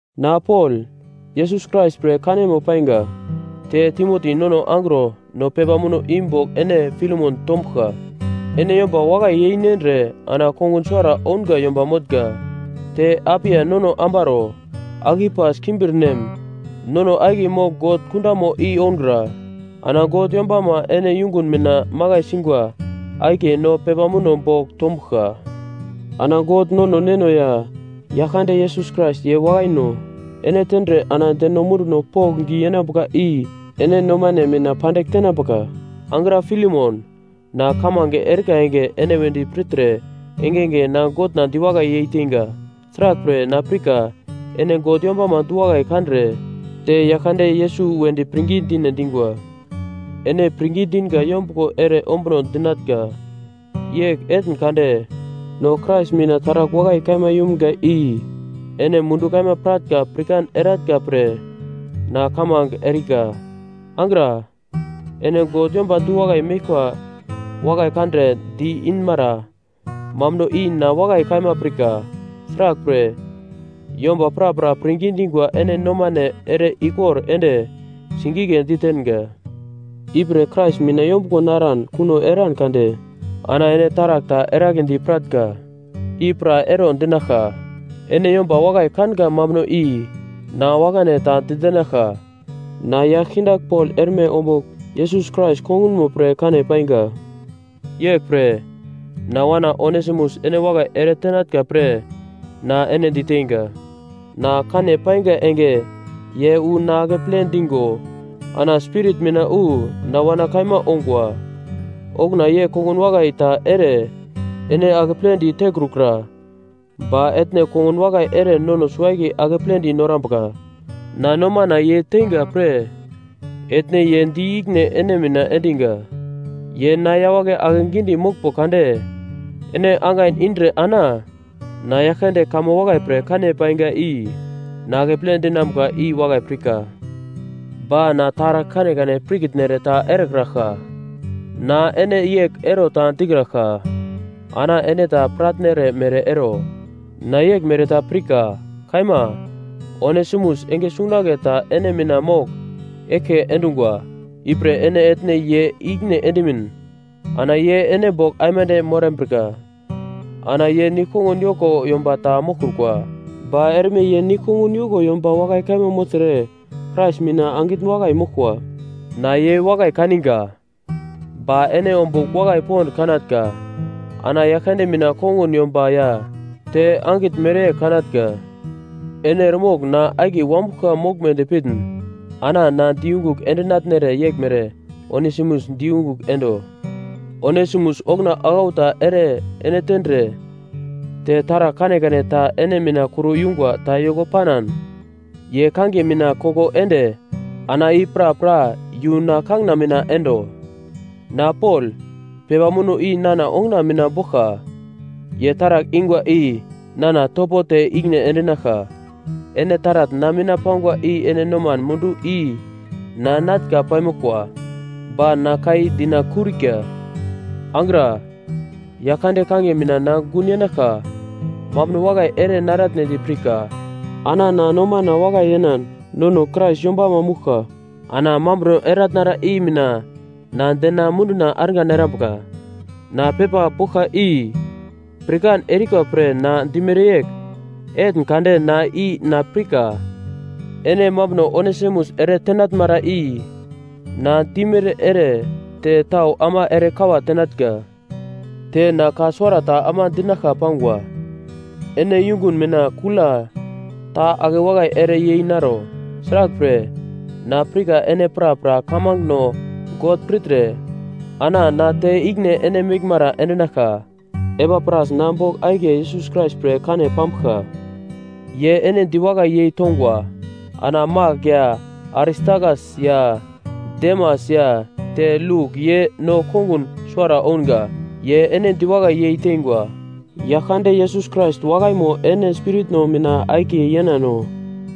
Na Pol, Yesus Krais pre kanemo painga, te Timoti nono angro no pepa muno i bogl ene Filemon tombuglka. Ene yomba wakai yeinendre, ana kongun suwara ounga yomba motnga. Te Apia nono ambaro, Akipas kimbirnem nono akiye mogl God kundamo i oungra. Ana God yombama ene yungun mina makai singwa akiye no pepa muno bogl tombuglka. Ana God nono Neno ya Yaglkande Yesus Krais, ye wakaino ene tendre ana deno munduno pokndi yenambuka i ene nomane mina pandigl tenambuka. Angra Filemon, na kamange erika enge ene wedi pirtre engenge na Godna diwakai yeiteinga. Sraglpre na pirka ene God yombama du-wakai kandre te Yaglkande Yesus wedi pirngi dine dingwa. Ene pirngi dinga yombuglo ere ombuno dinatnga, yegl etn kade no Krais mina taragl wakai kaima yumga i ene mundu kaima piratnga pirkan eratnga pre na kamange erika. Angra, ene God yomba du-wakai meglkwa wakai kandre di-inmara mambuno i na wakai kaima pirka. Sraglpre, yomba prapra pirngi dingwa ene nomane ere ikor ende sigigle ditenga. Ipre Krais mina yombuglo naran kuno eran kade ana ene taragl ta eragledi piratnga, i pra ero dinaglka. Ene yomba wakai kanga mambuno i na wakane ta ditenaglka. Na yagl kindagl Pol erme ombugl Yesus Krais kongunmo pre kane painga. Yeglpre, na wana Onesimus ene wakai ere tenatnga pre na ene diteinga. Na kane painga enge ye wu na akeple dingo ana spirit mina wu na wana kaima ongwa. Okuna ye kongun wakai ta ere ene akepledi tekrukura ba etne kongun wakai ere nono suwo-akiye akepledi norambuka. Na nomana ye teinga pre etne ye di ikine ene mina endinga. Ye na yawagle ake gidi moglmbo kade, ene angain indre ana na Yaglkande kamo wakai pre kane painga i na akeple dinambuka i wakai pirka. Ba na taragl kanekane pirkitnere ta erekraglka, na ene yegl ero ta dikraglka, ana ene ta piratnere mere ero. Na yeglmere ta pirka, kaima, Onesimus enge sungunagle ta ene mina mogl eglke endungwa, ipre ene etne ye ikine endimin ana ye ene bogl aimande morambrika. Ana ye nigl-kongun yoko yomba ta moglkrukwa, ba erme ye nigl-kongun yoko yomba wakai kaima mogltre Krais mina angitn wakai moglkwa. Na ye wakai kaninga. Ba ene ombugl wakai pond kanatnga, ana Yaglkande mina kongun yomba ya te angitn mereyegl kanatnga. Ene eremogl na akiye wanbuglka moglmedi pitn, ana na di yungugl endinatnere yeglmere Onesimus di yungugl endo. Onesimus okuna aglau ta ere ene tendre te taragl kanekane ta ene mina kur yungwa ta yoko panan, ye kangiye mina koko ende ana i prapra yu na kangina mina endo. Na Pol, pepa muno i nana onguna mina boglka. Ye taragl ingwa i nana topo te ikine endinaglka. Ene taratn na mina pangwa i ene noman mundu i na natnga paimoglkwa, ba na ka i dinakurika. Angra, Yaglkande kangiye mina na gun yenaglka mambuno wakai ere naratnedi pirka. Ana na nomana wakai yenan, nono Krais yombamo mouglka ana mambuno eratnara i mina na dena munduna argan erambuka. Na pepa boglka i, pirkan erika pre ene dimere yegl etn kade ana i na pirka, ene mambuno Onesimus ere tenatnmara i na dimere ere te tau ama ere kawa tenatnga. Te na ka suwarata ama dinaglka pangwa. Ene yungun mina kula ta ake wakai ere yei naro. Sraglpre, na pirka ene prapra kamangeno God pirtre, ana na te ikine ene meglmara endinaglka. Epapras na bogl akiye Yesus Krais pre kane pambuglka. Ye ene diwakai yei tongwa. Ana Mak ya Aristakas ya Demas ya te Luk ye no kongun suwara ounga, ye ene diwakai yei teingwa. Yaglkande Yesus Krais wakaimo ene spiritno mina akiye yenano.